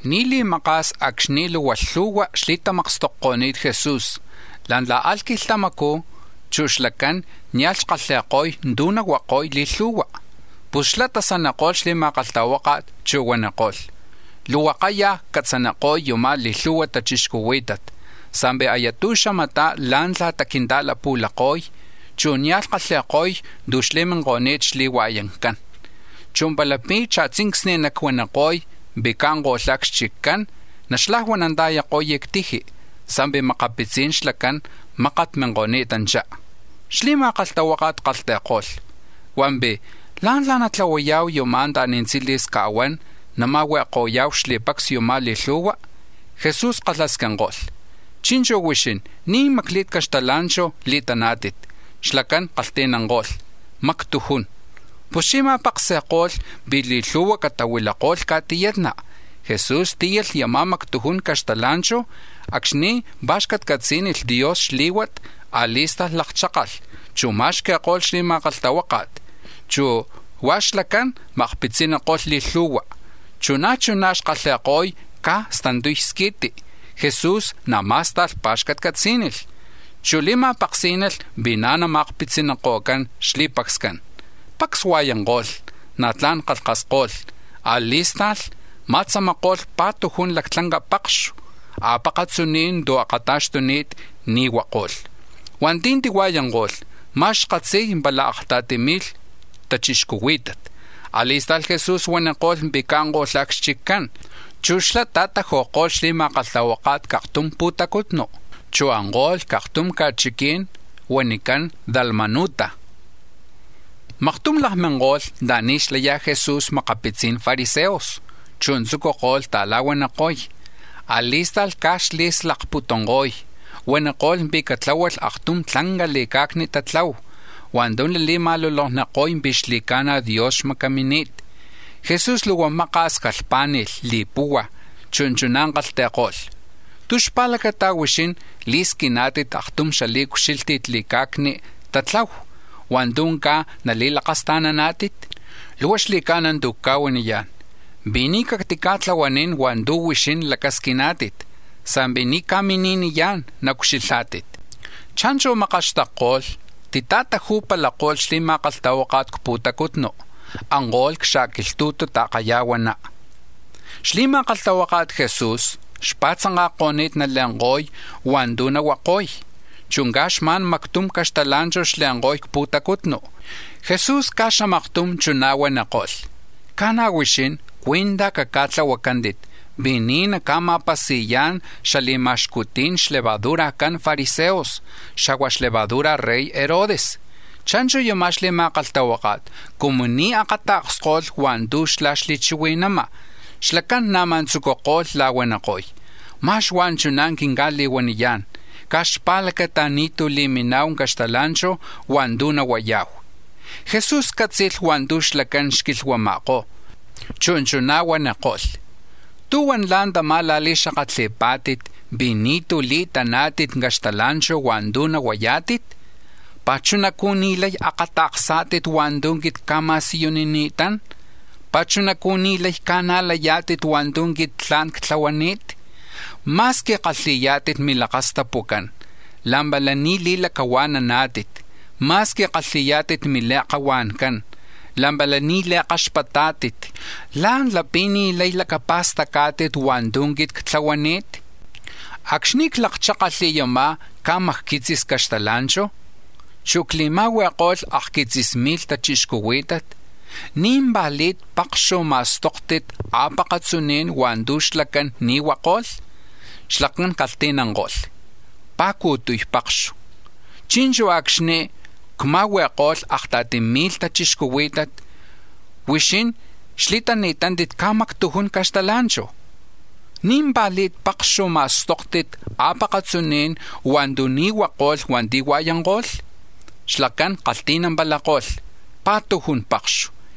Ni̱ li̱maka̱s acxni̱ luhua lhu̱hua̱ xli̱tamakstokni̱t Jesús, la̱ntla̱ alh quilhtamacú̱ chú̱ xlacán nia̱lh xkalhi̱ko̱y tu̱ nahuako̱y li̱lhu̱hua, pus xlá̱ tasaniko̱lh xli̱ma̱kalhtahuáka̱t, chu̱ huaniko̱lh: —Luhua kayaj ccatzaniko̱y yuma̱ li̱lhu̱hua tachixcuhuí̱tat, sa̱mpi̱ aya tu̱xamatá̱ la̱ntla̱ta quinta̱lapu̱lako̱y, chu̱ nia̱lh kalhi̱ko̱y tu̱ xli̱minko̱ni̱t xli̱hua̱yancán, chu̱ palapi̱ cha̱tzincsni̱ nacuaniko̱y pi̱ caanko̱lhá̱ c-xchiccán, naxlajuananta̱yako̱y c-tiji, sa̱mpi̱ makapitzi̱n xlacán, mákat minko̱ni̱tanchá. Xli̱ma̱kalhtahuáka̱t kalhti̱ko̱lh: —Hua̱mpi̱ ¿lá̱ntla̱ natlahuaya̱hu u̱nú̱ anta̱ni̱ tzili̱s ca̱huán nama̱hui̱ko̱ya̱hu xli̱pacs yuma̱ li̱lhu̱hua? Jesús kalhasquinko̱lh: —Chi̱nchu̱ huixín, ¿ní̱ macli̱t caxtala̱nchu̱ li̱tani̱tántit? Xlacán kalhti̱nanko̱lh: —Mactujún. Puschí̱ ma̱paksi̱ko̱lh pi̱ li̱lhu̱hua̱ catahuilako̱lh ca̱tiyatna, Jesús tíyalh yama̱ mactujun caxtala̱nchu̱; acxni̱ pa̱xcatcatzí̱nilh Dios xlí̱huat, a̱li̱sta̱lh lakchákalh, chu̱ ma̱xqui̱ko̱lh xli̱ma̱kalhtahuáka̱t, huá̱ chú̱ xlacán ma̱akpitziniko̱lh li̱lhu̱hua. Chu̱ na̱ chuná̱ xkalhi̱ko̱y caj stantuy squi̱ti; Jesús na̱ má̱sta̱lh pa̱xcatcatzí̱nit, chu̱ li̱ma̱paksi̱ko̱lh pi̱ na̱ nama̱akpitziniko̱cán xli̱pacscán. Pacs hua̱yanko̱lh, na̱ tla̱n kalhkasko̱lh; a̱li̱sta̱lh ma̱tzamako̱lh pa̱tujun lactlanca pakxu a̱pakatzuní̱n tu̱ xakata̱xtuni̱t ni̱ huako̱lh. Hua̱nti̱ tihua̱yanko̱lh, ma̱x xkatzi̱y pala akta̱ti mi̱lh tachixcuhuí̱tat. A̱li̱sta̱lh Jesús huaniko̱lh pi̱ caanko̱lhá̱ c-xchiccán, chu̱ xlá̱ ta̱taju̱ko̱lh xli̱ma̱kalhtahuáka̱t c-aktum pu̱tacutnu, chu̱ anko̱lh c-aktum ca̱chiquí̱n huanicán Dalmanuta. Maktum lakminko̱lh anta̱ni̱ xlaya̱ Jesús makapitzi̱n fariseos, chu̱ tzucuko̱lh ta̱la̱huaniko̱y; a̱li̱sta̱lh caj xli̱slakputunko̱y, huaniko̱lh pi̱ catláhualh aktum tlanca li̱ca̱cni tatlahu hua̱ntu̱ nali̱ma̱lolokniko̱y pi̱ xli̱ca̱na̱ Dios xmacamini̱t. Jesús luhua maka̱s jalhpá̱ni̱lh li̱puhua̱, chu̱ chuná̱ kalhti̱ko̱lh: —¿Tú̱ xpa̱lacata huixín li̱squiná̱tit aktum xali̱ucxílhti̱t li̱ca̱cni̱ tatlahu hua̱ntu̱ caj nali̱lakasta̱naná̱tit? Luhua xli̱ca̱na̱ tu̱ cca̱huaniyá̱n pi̱ ni̱ cactica̱tlahuanín hua̱ntu̱ huixín lacasquiná̱tit, sa̱mpi̱ ni̱ ca̱mini̱niyá̱n naucxilhá̱tit. Cha̱nchu̱ makaxtakko̱lh, tita̱taju̱palako̱lh xli̱ma̱kalhtahuáka̱t c-pu̱tacutnu, anko̱lh c-xa̱quilhtu̱tu ta̱kaya̱huaná. Xli̱ma̱kalhtahuaka̱t Jesús xpa̱tzanka̱ko̱ni̱t nale̱nko̱y hua̱ntu̱ nahuako̱y, chu̱ caj xma̱n mactum caxtala̱nchu̱ xle̱nko̱y c-pu̱tacutnu. Jesús caj xamaktum chuná̱ huaniko̱lh: —Ca̱na̱ huixín, cuí̱ntaj caca̱tlahuacántit pi̱ ni̱ naca̱ma̱pasi̱yá̱n xali̱ma̱xcuti̱n xlevadurajcán fariseos, xa̱hua̱ xlevadura̱ rey Herodes. Cha̱nchu̱ yuma̱ xli̱ma̱kalhtahuáka̱t cumu ni̱ akata̱ksko̱lh hua̱ntu̱ xlá̱ xli̱chihui̱nama̱, xlacán na̱má̱ tzucuko̱lh la̱huaniko̱y: —Ma̱x huá̱ chuná̱ quinca̱li̱huaniyá̱n caj xpa̱lacata ni̱tú̱ li̱mina̱hu caxtala̱nchu̱ hua̱ntu̱ nahuaya̱hu. Jesús cátzi̱lh hua̱ntu̱ xlacán xquilhuama̱kó̱, chu̱ chuná̱ huaniko̱lh: —¿Tú̱huan la̱ntamá̱ la̱li̱xakatli̱pá̱tit pi̱ ni̱tú̱ li̱taná̱tit caxtala̱nchu̱ hua̱ntu̱ nahuayá̱tit? ¿Pi̱ chunacú̱ ni̱ lay akata̱ksá̱tit hua̱ntu̱ quit cca̱ma̱siyunini̱tán? ¿Pi̱ chunacú̱ ni̱ lay ca̱najlayá̱tit hua̱ntu̱ quit tla̱n ctlahuay? Ma̱squi kalhi̱yá̱tit milakastapucán, la̱mpala ni̱ li̱lacahua̱naná̱tit. Ma̱squi kalhi̱yá̱tit mili̱akahua̱ncán la̱mpala ni̱ li̱kaxpatá̱tit. ¿Lá̱ntla̱ pi̱ ni̱ lay lacapa̱stacá̱tit hua̱ntu̱ quit ctlahuanit? Acxni̱ clakchákalh yama̱ caj macquitzis caxtala̱nchu̱, chu̱ cli̱ma̱huiko̱lh akquitzis mi̱lh tachixcuhuí̱tat, ¿ní̱mpa̱li̱t pakxu̱ ma̱stóktit a̱pakatzuní̱n hua̱ntu̱ xlacán ni̱ huako̱lh? Xlacán kalhti̱nanko̱lh: —Pa̱cu̱tuy pakxu. —Chi̱nchu̱ acxni̱ cma̱hui̱ko̱lh akta̱ti mi̱lh tachixcuhuí̱tat, huixín xli̱tani̱tántit caj mactujun caxtala̱nchu̱, ¿ní̱mpa̱li̱t pakxu̱ ma̱stóktit a̱pakatzuní̱n hua̱ntu̱ ni̱ huako̱lh hua̱nti̱ hua̱yanko̱lh? Xlacán kalhti̱nampalako̱lh: —Pa̱tujun pakxu.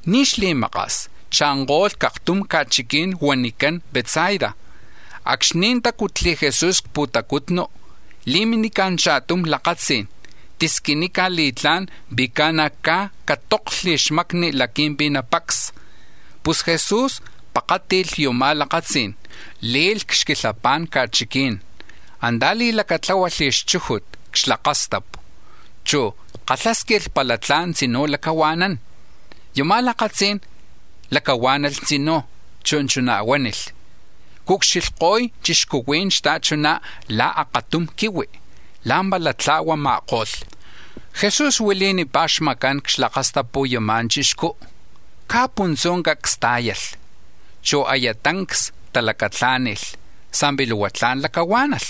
Ni̱ xli̱maka̱s cha̱nko̱lh c-aktum ca̱chiquí̱n huanicán Betsaida. Acxni̱ tácutli̱ Jesu̱s c-pu̱tacutnu, li̱minica̱ cha̱tum lakatzí̱n, tisquinica̱ li̱tlá̱n pi̱ ca̱na̱ caj catóklhli̱ xmacni̱ laqui̱mpi̱ napacsa. Pus Jesús pakáti̱lh yama̱ lakatzí̱n, le̱lh c-xquilhapa̱n ca̱chiquí̱n, antá̱ li̱lacatláhualh xchújut c-xlakastapu, chu̱ kalhásquilh pala tla̱n tzinú̱ lacahua̱nán. Yama̱ lakatzí̱n lacahuá̱nalh tzinú̱, chu̱ chuná̱ huánilh: —Cucxilhko̱y chixcuhuí̱n xta̱chuná̱ la̱ akatum quihui, la̱mpala tla̱huama̱ko̱lh. Jesús huili̱nipá̱ xmacán c-xlakastapu̱ yama̱ chixcú, caj puntzú̱ cacs tá̱yalh, chu̱ aya tancs talacatlá̱ni̱lh, sa̱mpi̱ luhua tla̱n lacahuá̱nalh.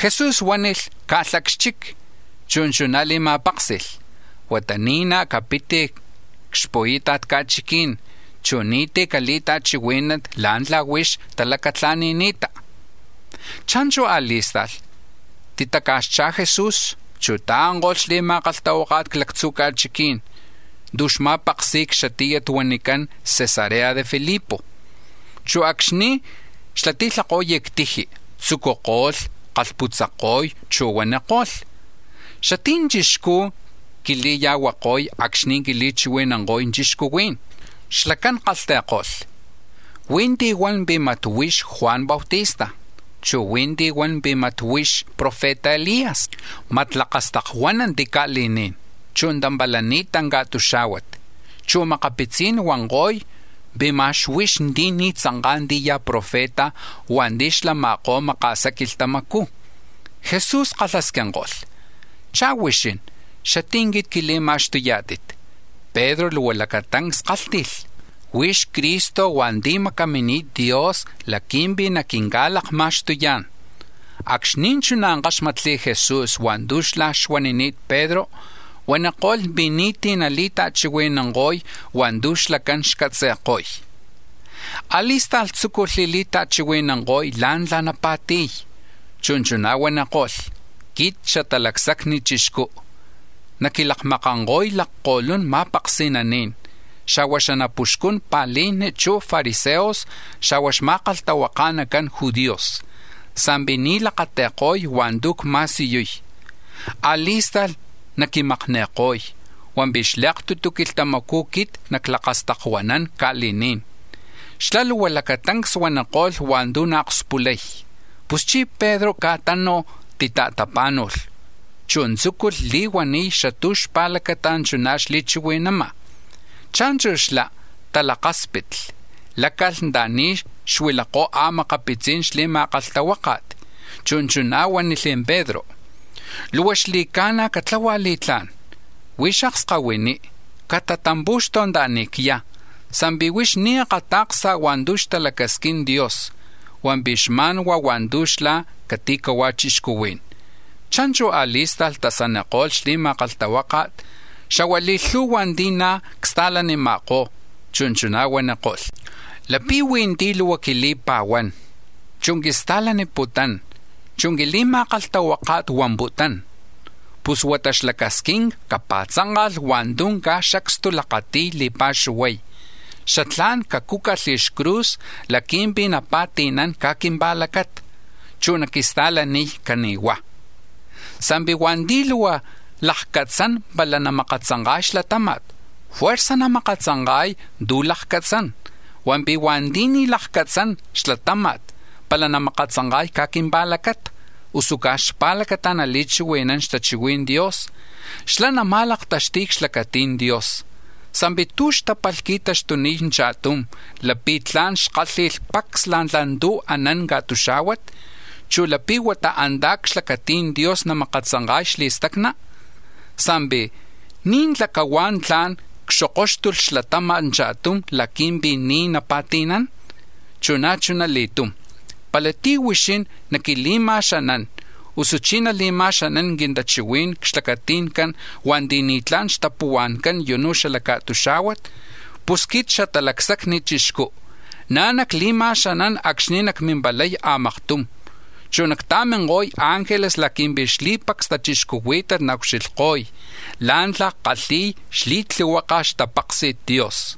Jesús huánilh caalhá̱ c-xchic, chu̱ chuná̱ li̱ma̱páksi̱lh: —Huata ni̱ naj capit c-xpu̱ita̱t ca̱chiquí̱n, chu̱ ni̱tí̱ cali̱ta̱chihuí̱nanti̱ la̱ntla̱ huix lacahua̱nani̱ta. Cha̱nchu̱ a̱li̱sta̱lh titaca̱xchá̱ Jesús, chu̱ ta̱anko̱lh xli̱ma̱kalhtahuáka̱t c-lactzu̱ ca̱chiquí̱n tu̱ xma̱paksi̱ko̱y c-xatíyat huanicán Cesarea de Filipo, chu̱ acxni̱ xlati̱lhako̱y c-tiji, tzucuko̱lh kalhputzako̱y, chu̱ huaniko̱lh: —¿Xatí̱ chixcú̱ quili̱ya̱huako̱y acxni̱ quili̱chihui̱nanko̱y chixcuhuí̱n? Xlacán kalhti̱ko̱lh: —Huí̱ ti̱ huan pi̱ mat huix Juan Bautista, chu̱ huí̱ ti̱ huan pi̱ ma̱x huix profeta Elías, mat lakastakuánanti̱ ca̱li̱ní̱n, chu̱ tampalani̱ta̱ ca̱tuxá̱huat, chu̱ makapitzí̱n huanko̱y pi̱ mat huix ti̱ ni̱ tzanká̱ tí̱ ya̱ profeta hua̱nti̱ xlama̱kó̱ maka̱sa quilhtamacú̱. Jesús kalhasquinko̱lh: —¿Chá̱ huixín, xatí̱ quit quili̱ma̱xtuyá̱tit? Pedro luhua lacatancs kálhti̱lh: —Huix Cristo hua̱nti̱ macamini̱t Dios laqui̱mpi̱ naquinca̱lakma̱xtuyá̱n. Acxni̱ chuná̱ káxmatli̱ Jesús hua̱ntu̱ xlá̱ xuanini̱t Pedro, huaniko̱lh pi̱ ni̱tí̱ nali̱ta̱chihui̱nanko̱y hua̱ntu̱ xlacán xcatzi̱ko̱y. A̱li̱sta̱lh tzúculh li̱ta̱chihui̱nanko̱y la̱ntla̱ napa̱ti̱y, chu̱ chuná̱ huaniko̱lh: —Quit Xatalacsacni Chixcú̱ naquilakmakanko̱y lakko̱lun ma̱paksi̱naní̱n, xa̱hua̱ xanapuxcun pa̱lijni, chu̱ fariseos, xa̱hua̱ xma̱kalhtahuaka̱nacan judíos, sa̱mpi̱ ni̱ lakati̱ko̱y hua̱ntu̱ cma̱siyuy. A̱li̱sta̱lh naquimakni̱ko̱y, hua̱mpi̱ xli̱aktutu quilhtamacú̱ quit naclakastakuanán ca̱li̱ní̱n. Xlá̱ luhua lacatancs huaniko̱lh hua̱ntu̱ naakspulay. Puschí̱ Pedro caj tánuj tita̱tapá̱nu̱lh, chu̱ tzúculh li̱huaniy xatú̱ xpa̱lacata chuná̱ xli̱chihui̱nama̱. Cha̱nchu̱ xlá̱ talakáspitli; láca̱lh anta̱ni̱ xuilakó̱ a̱makapitzi̱n xli̱ma̱kalhtahuáka̱t, chu̱ chuná̱ huánilh Pedro: —Luhua xli̱ca̱na̱ catlahua̱ li̱tlá̱n, huix akskahuiní, catatampu̱xtu̱ anta̱ni̱ cyá̱, sa̱mpi̱ huix ni̱ akata̱ksa̱ hua̱ntu̱ xtalacasquin Dios, hua̱mpi̱ xma̱n hua̱ntu̱ xla cati̱hua̱ chixcuhuí̱n. Cha̱nchu̱ a̱li̱sta̱lh tasaniko̱lh xli̱ma̱kalhtahuáka̱t, xa̱hua̱ li̱lhu̱hua̱ ti̱ na̱ csta̱lanima̱kó̱, chu̱ chuná̱ huaniko̱lh: —Lapi̱ huí̱ ti̱ luhua quili̱pa̱huán, chu̱ quista̱laniputún, chu̱ quili̱ma̱kalhtahuáka̱t huamputún, pus huata xlacasquinca̱ capa̱tzánka̱lh hua̱ntu̱ caj xacstu lakati̱y li̱pa̱xuhuay, xatlá̱n cacúcalh xcruz laqui̱mpi̱ napa̱ti̱nán caj quimpa̱lacata, chu̱ caquista̱lánilh cani̱huá̱. Sa̱mpi̱ hua̱nti̱ luhua lakcatzán pala namakatzanka̱y xlatáma̱t, juerza̱ namakatzanka̱y tu̱ lakcatzán, hua̱mpi̱ hua̱nti̱ ni̱ nalakcatzán xlatáma̱t pala namakatzanka̱y caj quimpa̱lacata, usu caj xpa̱lacata nali̱chihui̱nán xtachihui̱n Dios, xlá̱ nama̱laktaxti̱y c-xlacati̱n Dios. Sa̱mpi̱ ¿tú̱ xtápalh qui̱taxtuniy cha̱tum, lapi̱ tla̱n xkálhi̱lh pacs la̱ntla̱ tu̱ anán ca̱tuxá̱huat, chu̱ lapi̱ huata antá̱ c-xlacati̱n Dios namakatzanka̱y xli̱stacna? Sa̱mpi̱ ¿ní̱ntla̱ cahuá̱ tla̱n cxokóxtulh xlatáma̱t cha̱tum laqui̱mpi̱ ni̱ napa̱ti̱nán? Chu̱ na̱ chuna li̱tum, pala tí̱ huixín naquili̱ma̱xanán, usuchí̱ nali̱ma̱xanán quintachihuí̱n c-xlacati̱ncan hua̱nti̱ ni̱tla̱n xtapuhua̱ncán yunú̱ xala ca̱tuxá̱huat, pus quit Xatalacsacni Chixcú̱ na̱ nacli̱ma̱xanán acxni̱ nacmimpalay a̱maktum, chu̱ nacta̱minko̱y ángeles laqui̱mpi̱ xli̱pacs tachixcuhuí̱tat naucxilhko̱y la̱ntla̱ kalhi̱y xli̱tlihuaka̱ xtapaksi̱t Dios.